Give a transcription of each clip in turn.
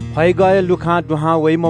फैजवाः धाःसा लुखां दुहां वइ।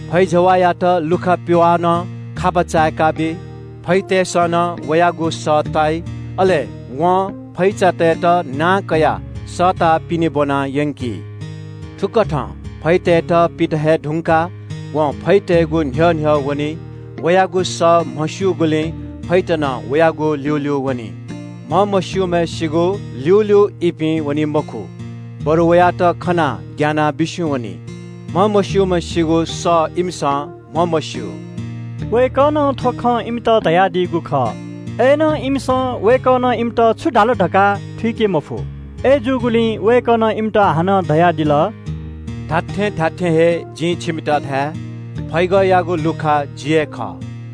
फैजवाःयात लुखा पिवालं खापा चाय्‌काबी। फैतय्‌सं नं वयागु सः ताइ। अले वं फैचातय्‌त नां कयाः सःताः पिने ब्‍वना यंकी। थुकथं फैतय्‌त पित हये धुंकाः व फैतय्‌गु न्‍ह्यः न्‍ह्यः वनी। वयागु सः म्‍हस्‍यूगुलिं फैत नं वयागु ल्‍यूल्‍यू वनी। म्‍हमस्‍यूम्‍हय्‌सिगु ल्‍यूल्‍यू इपिं वनी मखु, बरु वयात खनाः ग्‍यानाः बिस्‍युं वनी। म्‍हमस्‍यूम्‍हय्‌सिगु सः इमिसं म्‍हमस्‍यू।” वय्‌कलं थ्‍व खँ इमित धयादीगु खः। अय्‌नं इमिसं वय्‌कलं इमित छु धाल धकाः थुइके मफु। अय्‌जूगुलिं वय्‌कलं इमित हानं धयादिल – “जिं छिकपिन्‍त खःगु खँ धाये – फैगःयागु लुखा जि हे खः।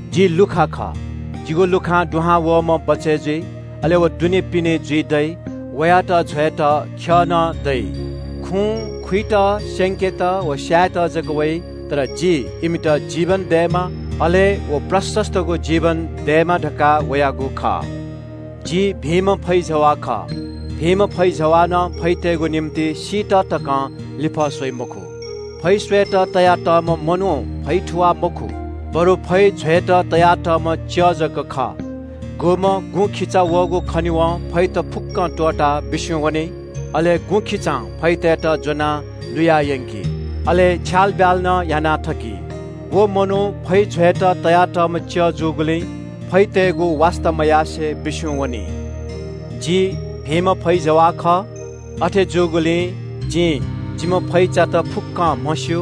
जि लुखा खः। जिगु लुखां दुहां वःम्‍ह बचय् जुइ, अले व दुनेपिने जुइ दइ, वयात ज्‍वयेत ख्‍यः नं दइ। खुँ खुइत, स्‍यंकेत व स्‍यायेत जक वइ। तर जि इमित जीवन दयेमा, अले व यक्‍व जीवन दयेमा धकाः वयागु खः। “जि भिंम्‍ह फैजवाः खः। भिंम्‍ह फैजवालं फैतय्‌गु निंतिं सीत तकं लिफः स्‍वइ मखु। फै स्‍वयेत तयातःम्‍ह मनू फैथुवाः मखु, बरु फै ज्‍वयेत तयातःम्‍ह च्‍यः जक खः, गुम्‍ह गुँखिचा वःगु खनेवं फैत फुक्‍क त्‍वःताः बिस्‍युं वनी। अले गुँखिचां फैतय्‌त ज्‍वनाः लुया यंकी, अले छ्यालब्‍याल नं याना थकी। व मनू फै ज्‍वयेत तयातःम्‍ह च्‍यः जूगुलिं फैतय्‌गु वास्‍ता मयासें बिस्‍युं वनी। “जि भिंम्‍ह फैजवाः खः। अथे जूगुलिं जिं जिम्‍ह फैचात फुक्‍कं म्‍हस्‍यू,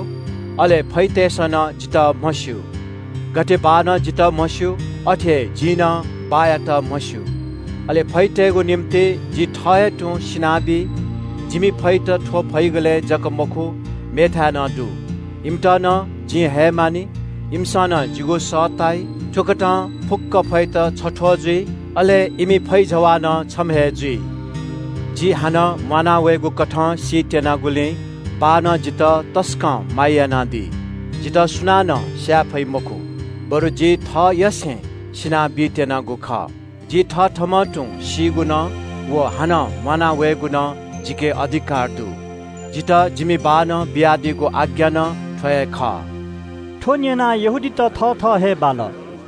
अले फैतय्‌सं नं जितः म्‍हस्‍यू। गथे बाःनं जितः म्‍हस्‍यू, अथे हे जिं नं बाःयात म्‍हस्‍यू। अले फैतय्‌गु निंतिं जि थः हे तुं सिना बी। जिमि फैत थ्‍व फैगलय् जक मखु, मेथाय् नं दु। इमित नं जिं हयेमानि। इमिसं नं जिगु सः ताइ। थुकथं फुक्‍क फैत छथ्‍वः जुइ, अले इमि फैजवाः नं छम्‍ह हे जुइ। “जि हानं म्‍वाना वयेगु कथं सी त्‍यनागुलिं बाःनं जितः तसकं माया यानादी। जितः सुनानं स्‍याये फइ मखु, बरु जि थःयसें सिना बीत्‍यनागु खः। जि थथःम्‍हं तुं सीगु नं व हानं म्‍वाना वयेगु नं जिके अधिकार दु। जितः जिमि बाःनं बियादीगु आज्ञा नं थ्‍व हे खः।” थ्‍व न्‍यनाः यहूदीतय् नायःत थथः हे बाल।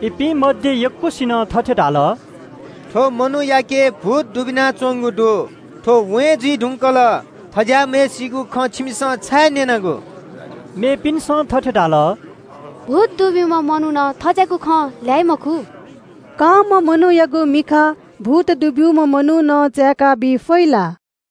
इपिं मध्‍ये यक्‍वसिनं थथे धाल – “थ्‍व मनूयाके भूत दुबिनाच्‍वंगु दु। थ्‍व वें जुइ धुंकल। थज्‍याःम्‍हय्‌सिगु खँ छिमिसं छाय् न्‍यनागु?” मेपिन्‍सं थथे धाल – “भूत दुब्‍यूम्‍ह मनुखं थज्‍याःगु खँ ल्‍हाइ मखु। कांम्‍ह मनूयागु मिखा भूत दुब्‍यूम्‍ह मनुखं चाय्‌काबी फइ ला?”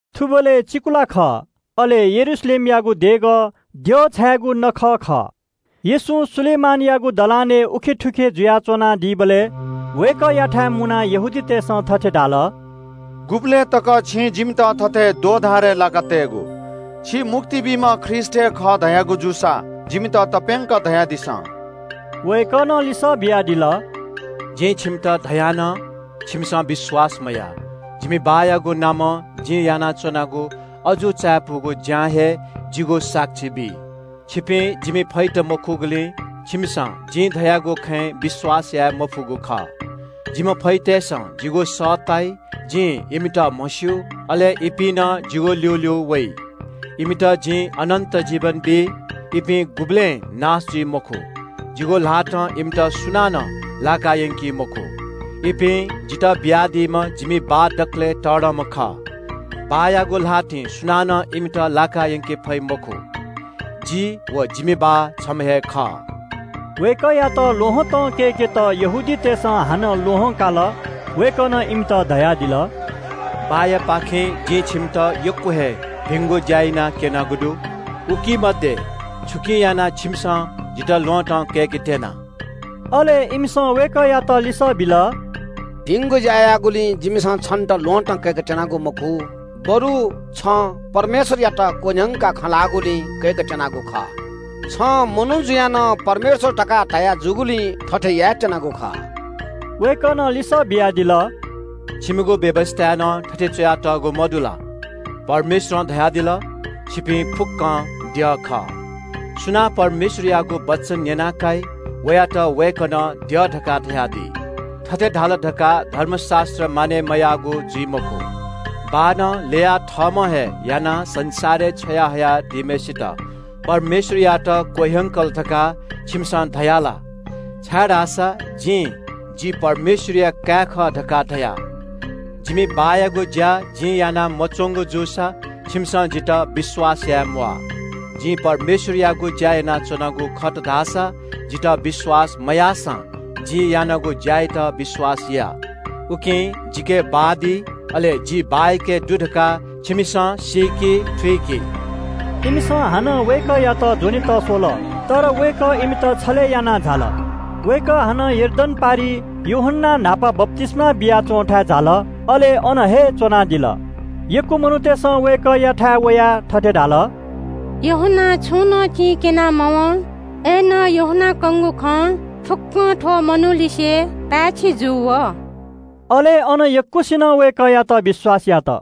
थुबलय् चिकुला खः। अले यरूशलेमयागु देगः देछाय्‌गु नखः खः। येशू सोलोमन धाःगु दलानय् थुखे उखे जुयाच्‍वनादीबलय् वय्‌कःयाथाय् मुनाः यहूदीतय् नायःतय्‌सं थथे धाल – “गुबलय् तक छिं जिमित थथे दोमन याका तयेगु? छि मुक्ति बीम्‍ह ख्रीष्‍ट हे खः धयागु जूसा जिमित तप्‍यंक धयादिसँ।” वय्‌कलं लिसः बियादिल – “जिं छिकपिन्‍त धया नं छिकपिन्‍सं विश्‍वास यानामदी। जिमि बाःयागु नामं जिं यानाच्‍वनागु अजू चायापुगु ज्‍यां हे जिगु साक्षी बी। छिकपिं जिमि फैत मखुगुलिं छिकपिन्‍सं जिं धयागु खँय् विश्‍वास यानादी मफुगु खः। जिम्‍ह फैतय्‌सं जिगु सः ताइ, जिं इमित म्‍हस्‍यू, अले इपिं नं जिगु ल्‍यूल्‍यू वइ। इमित जिं अनन्‍त जीवन बी। इपिं गुबलें नाश जुइ मखु। जिगु ल्‍हातं इमित सुनानं लाकायंकी मखु। इपिं जितः बियादीम्‍ह जिमि बाः दकलय् तःधंम्‍ह खः। बाःयागु ल्‍हातिं सुनानं इमित लाकायंके फइ मखु। जि व जिम्‍ह बाः छम्‍ह हे खः।” वय्‌कःयात ल्‍वहँतं कय्‌केत यहूदीतय् नायःतय्‌सं हानं ल्‍वहं काल। वय्‌कलं इमित धयादिल – “बाःयापाखें जिं छिकपिन्‍त यक्‍व हे भिंगु ज्‍या यानाः क्‍यनागु दु, उकी मध्‍ये छुकिं यानाः छिकपिन्‍सं जितः ल्‍वहँतं कय्‌केत्‍यना?” अले इमिसं वय्‌कःयात लिसः बिल – “भिंगु ज्‍या याःगुलिं जिमिसं छन्‍त ल्‍वहँतं कय्‌केत्‍यनागु मखु, बरु छं परमेश्‍वरयात क्‍वह्यंकाः खँ ल्‍हाःगुलिं कय्‌केत्‍यनागु खः। छं मनू जुयाः नं परमेश्‍वर धकाः धया जूगुलिं थथे यायेत्‍यनागु खः।” वय्‌कलं लिसः बियादिल – “छिकपिनिगु व्‍यवस्‍थाय् नं थथे च्‍वयातःगु, मदु ला– ‘परमेश्‍वरं धयादिल – “छिपिं फुक्‍कं द्यः खः?”’ सुनां परमेश्‍वरयागु वचन न्‍यना काइ, वयात वय्‌कलं द्यः धकाः धयादी। थथे धाल धकाः धर्मशास्‍त्र मानय् मयाःगु जुइ मखु। बाःनं ल्‍ययाः थःम्‍ह हे यानाः संसारय् छ्वया हयादीम्‍हय्‌सित परमेश्‍वरयात क्‍वह्यंकल धकाः छिकपिन्‍सं धयादीया ला, छाय्‌धाःसा जिं ‘जि परमेश्‍वरया काय् खः’ धकाः धया? जिमि बाःयागु ज्‍या जिं याना मच्‍वंगु जूसा छिकपिन्‍सं जितः विश्‍वास यानादीम्‍वाः। जिं परमेश्‍वरयागु ज्‍या यानाच्‍वनागु दुसा जितः विश्‍वास मयाःसां जिं यानागु ज्‍या यात विश्‍वास यानादिसँ। उकिं जिके बाः दी, अले जि बाःयाके दु धकाः छिकपिन्‍सं सीकादिसँ, थुइकादिसँ।” इमिसं हानं वय्‌कःयात ज्‍वनेत स्‍वल। तर वय्‌कः इपिंपाखें बचय् जुयाः झाल। वय्‌कः हानं यर्दन पारिइ यूहन्‍नां न्‍हापा बप्‍तिस्‍मा बिया च्‍वंथाय् झाल, अले अन हे च्‍वनादिल। यक्‍व मनूतय्‌सं वय्‌कःयाथाय् वयाः थथे धाल – “यूहन्‍नां छुं नं चिं क्‍यना मवं, अय्‌नं यूहन्‍नां कंगु खँ फुक्‍कं थ्‍व मनूलिसे पाय्‌छि जू वः।” अले अन यक्‍वसिनं वय्‌कःयात विश्‍वास यात।